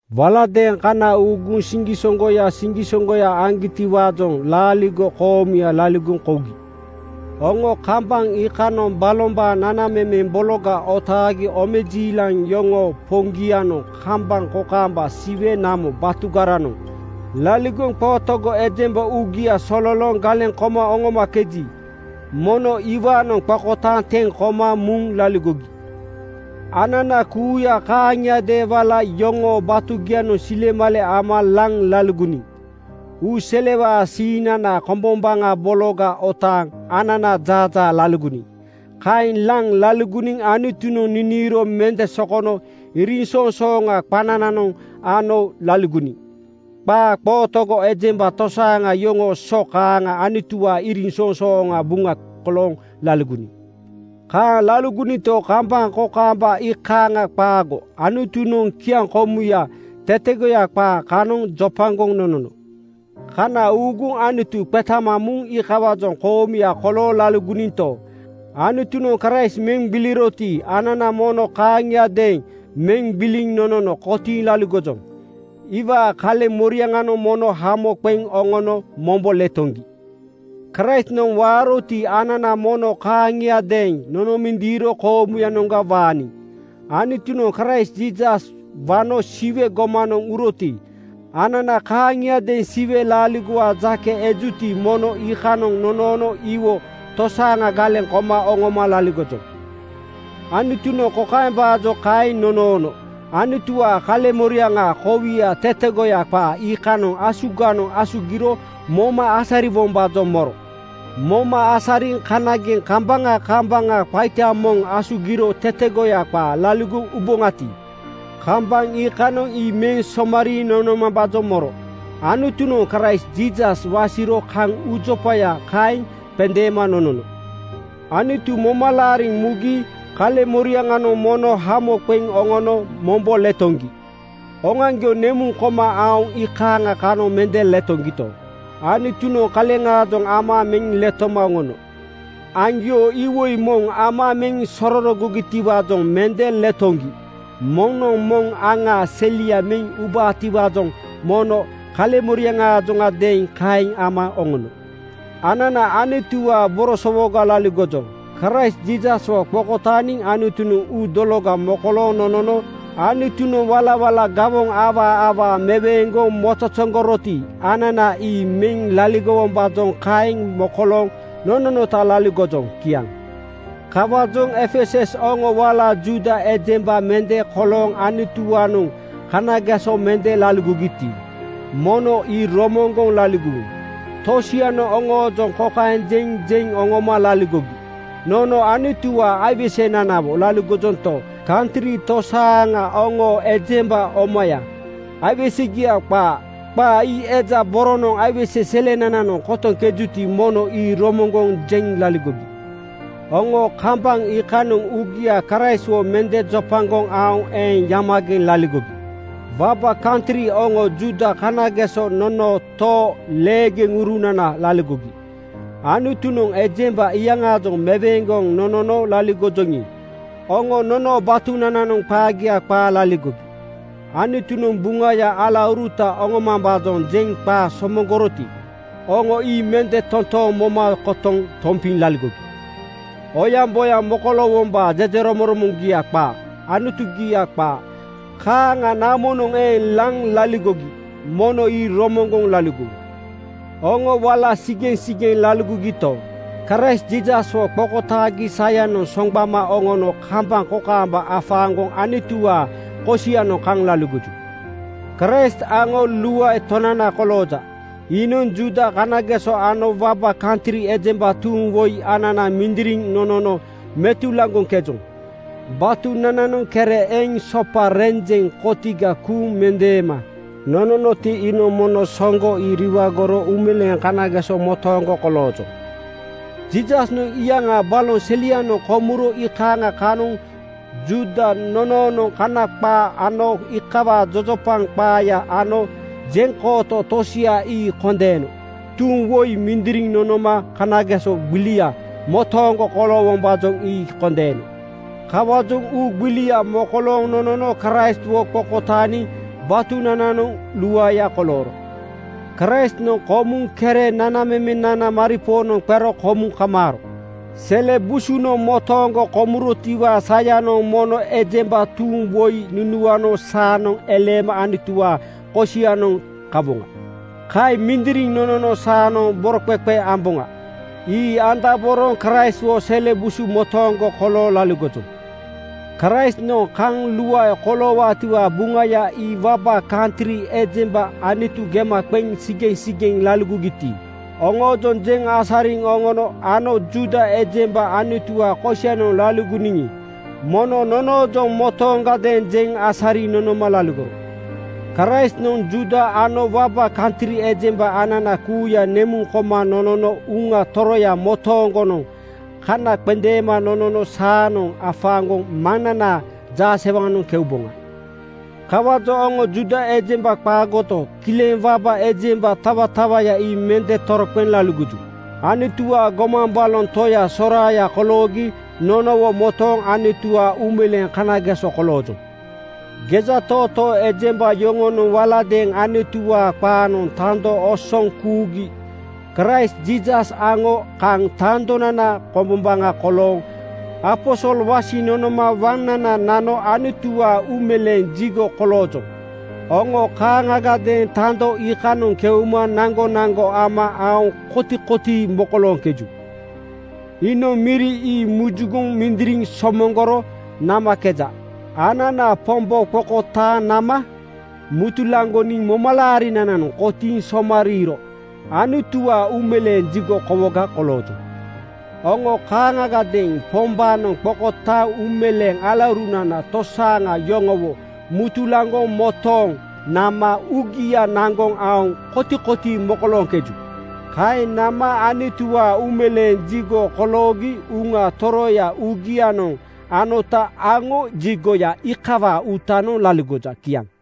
Waladeeŋ kana uuguŋ siŋgisoŋgoya siŋgisoŋgoya aŋgiti-waajoŋ laaligo koomuya laligoŋ kougi. Oŋo kambaŋ iikanoŋ balombaa nanamemeŋ bologa otaagi. Omejiilaŋ yoŋoo Poŋgianoŋ kambaŋ kokaamba Siwe namo batugaranoŋ laligoŋ qootogo ejemba uugia sololooŋ galeŋ koma oŋomakeji, mono iwaanoŋ qokotaaŋ teŋ koma muŋ laligogi. Anana kuuya kaaŋiadeeŋ wala yoŋoo batugianoŋ silemale ama laŋ laligoniŋ. Uu selewaa siiŋnana kombombaŋa bologa otaaŋ ananaa jaajaa laligoniŋ. Kaeŋ laŋ laligoniŋ Anutunoŋ niniiro mende sokono iriŋsoŋsooŋa qanananoŋ ano laligoniŋ. Qaa qootogo ejemba tosaaŋa yoŋoo so kaaŋa Anutuwaa iriŋsoŋsooŋaa buŋa kolooŋ laligoniŋ. Kaaŋ laligoninto, kambaŋ kokaamba iikaaŋ qaago. Anutunoŋ kiaŋkomuya tetegoya qaa kanoŋ jopagoŋ nonono. Kana uuguŋ Anutu qetama muŋ iikawaajoŋ koomuya kolooŋ laligoninto, Anutunoŋ Kraist meŋ gbiliroti, anana mono kaaŋiadeeŋ meŋ gbiliŋ nonono kotiiŋ laligojoŋ. Iwaa kaleŋ moriaŋanoŋ mono hamo qeŋ oŋono mombo letoŋgi. Kraistnoŋ waaroti, anana mono kaaŋiadeeŋ nonomindiiro koomuyanoŋa waaniŋ. Anutunoŋ Kraist Jiisas wano Siwe gomanoŋ uroti, anana kaaŋiadeeŋ Siwe laaligowaa jake ejuti, mono iikanoŋ nonoono iwo tosaaŋa galeŋ koma oŋoma laligojoŋ. Anutunoŋ kokaembaajoŋ kaeŋ nonoono: Anutuwaa kaleŋ-moriaŋaa kowia tetegoya qaa iikanoŋ asuganoŋ asugiro moma asariwombaajoŋ moro. Moma asariŋ kanageŋ kambaŋa kambaŋa qaita moŋ asugiro tetegoya qaa laligoŋ uboŋati, kambaŋ iikanoŋ ii meŋ somariiŋ nonomambaajoŋ moro. Anutunoŋ Kraist Jiisas wasiro kaŋ uujopaya kaeŋ qendeema nonono. Anutu moma laariŋ mugi kaleŋmoriaŋanoŋ mono hamo qeŋ oŋono mombo letoŋgi. Oŋoaŋgio nemuŋ koma aoŋ iikaaŋa kanoŋ mende letoŋgito, Anutunoŋ kaleŋaajoŋ ama meŋ letoma oŋono. Aŋgio iwoi moŋ ama meŋ sororogogitiwaajoŋ mende letoŋgi. Moŋnoŋ moŋ aŋaa selia meŋ ubabotiwaajoŋ mono kaleŋmoriaŋaajoŋadeeŋ kaeŋ ama oŋono. Anana Anutuwaa borosowoga laligojoŋ. Kraist Jiisaswo qokotaaniŋ Anutunoŋ uu dologa mokolooŋ nonono. Anutunoŋ walawala gawoŋ awaa awaa meweeŋgoŋ mozozoŋgoroti, anana ii meŋ laligowombaajoŋ kaeŋ mokolooŋ nononota laligojoŋ. Kiaŋ. Kawaajoŋ Efesus oŋo wala Juuda ejemba mende kolooŋ Anutuwaanoŋ kanageso mende laligogiti, mono ii romoŋgoŋ laligowu. Tosianoŋ oŋoojoŋ kokaeŋ jeŋ jeŋ oŋoma laligogi, “Nono Anutuwaa aiwesenanawo laligojonto, kantri tosaaŋa oŋo ejemba omaya aiwesegia qaa!” Qa ii eja boronoŋ aiwese selenananoŋ kotoŋkejuti, mono ii romoŋgoŋ jeŋ laligogi. Oŋo kambaŋ iikanoŋ uugia Kraistwo mende jopagoŋ aoŋ eeŋ yamageŋ laligogi. Waba kantri oŋo Juuda kanageso nonoo too leeurunanaga laligogi. Anutunoŋ ejemba iyaŋaajoŋ meweeŋgoŋ nonono laligojoŋi, oŋo nonoo batunananoŋ qagia qaa laligogi. Anutunoŋ Buŋaya alauruta oŋomambaajoŋ jeŋ qaa somoŋgoroti, oŋo ii mende totooŋ moma kotoŋ tompiŋ laligogi. Oyaŋboyaŋ koloowombaa jejeromoŋromoŋgia qaa. Anutugia qaa kaaŋa namonoŋ eeŋ laŋ laligogi. Mono ii romoŋgoŋ laligowu. Oŋo wala sigeŋsigeŋ laligogito, Kraist Jiisaswo qokotaagi sayanoŋ soŋgbama oŋono kambaŋ kokaamba afaaŋgoŋ Anutuwaa kosianoŋ kaŋ laligoju. Kraist aŋo luae Tonana kolooja. Iinoŋ Juuda kanageso ano waba kantri ejemba tuuŋ woi anana mindiriŋ nonono mutulaŋgoŋkejoŋ. Batunananoŋ kere eŋ sopa renjeŋ kotiga kuuŋ mendeema nononoti, iinoŋ mono soŋgo ii riwagoro uumeleeŋ kanageso motooŋgo koloojoŋ. Jiisasnoŋ iyaŋaa baloŋ selianoŋ komuro iikaaŋa kanoŋ Juuda nonoonoŋ Kana qaa ano iikawaa jojopaŋ qaaya ano jeŋkooto tosia ii kondeeno. Tuuŋ woi mindiriŋ nonoma kanageso gbilia motooŋgo koloowombaajoŋ ii kondeeno. Kawaajoŋ uu gbilia mokolooŋ nonono Kraistwo qokotaaniŋ batunananoŋ luaeya kolooro. Kraistnoŋ komuŋ kere nanamemenana maripoonoŋ qero komuŋ kamaaro. Sele busunoŋ motooŋgo komurotiwaa sayanoŋ mono ejemba tuuŋ woi nunuano saanoŋ eleema Anutuwaa kosianoŋ kawoŋa. Kaeŋ mindiriŋ nonono saanoŋ boroqeqe amboŋa. Ii andaboroŋ Kraistwo sele busu motooŋgo kolooŋ laligojoŋ. Kraistnoŋ kaŋ luae koloowaatiwaa Buŋaya ii waba kantri ejemba Anutu gema qeŋ sigeŋsigeŋ laligogiti, oŋoojoŋ jeŋ asariŋ oŋono ano Juuda ejemba Anutuwaa kosianoŋ laligoniŋi, mono nonoojoŋ motooŋadeeŋ jeŋ asariŋ nonoma laligoro. Kraistnoŋ Juuda ano waba kantri ejemba anana kuuya nemuŋ koma nonono Uŋa Toroya motooŋgonoŋ kana qendeema nonono saanoŋ afaaŋgoŋ Maŋnanaa jaasewaŋanoŋ keuboŋa. Kawaajoŋ oŋo Juuda ejemba qaagoto, kileŋ waba ejemba tawatawaya ii mende toroqeŋ laligoju. Anutuwaa gomaŋ baloŋ toya soraaya koloogi nonowo motooŋ Anutuwaa uumeleeŋ kanageso koloojoŋ. Gejatootoo ejemba yoŋonoŋ waladeeŋ Anutuwaa qaanoŋ tando osoŋ kuugi Kraist Jiisas aŋo kaŋ tandonana kombombaŋa kolooŋ aposol wasiŋ nonoma waŋnana nano Anutuwaa uumeleeŋ jigo koloojoŋ. Oŋo kaaŋagadeeŋ tando iikanoŋ keuma naŋgonaŋgo ama aoŋ kotikotii mokolooŋkeju. Iinoŋ miri ii muzugoŋ mindiriŋ somoŋgoro namakeja. Anana Pombo qokotaaŋ nama mutulaŋgoniŋ momalaarinananoŋ kotiiŋ somariiro Anutuwaa uumeleeŋ jigo kowoga koloojoŋ. Oŋo kaaŋagadeeŋ Pombaanoŋ qokotaaŋ uumeleeŋ alaurunana tosaaŋa yoŋowo mutulaŋgoŋ motooŋ nama uugia naŋgoŋ aoŋ kotikotii mokolooŋkeju. Kaeŋ nama Anutuwaa uumeleeŋ jigo koloogi Uŋa Toroya uugianoŋ anota aŋo jigoya iikawaa uutanoŋ laligoja. Kiaŋ.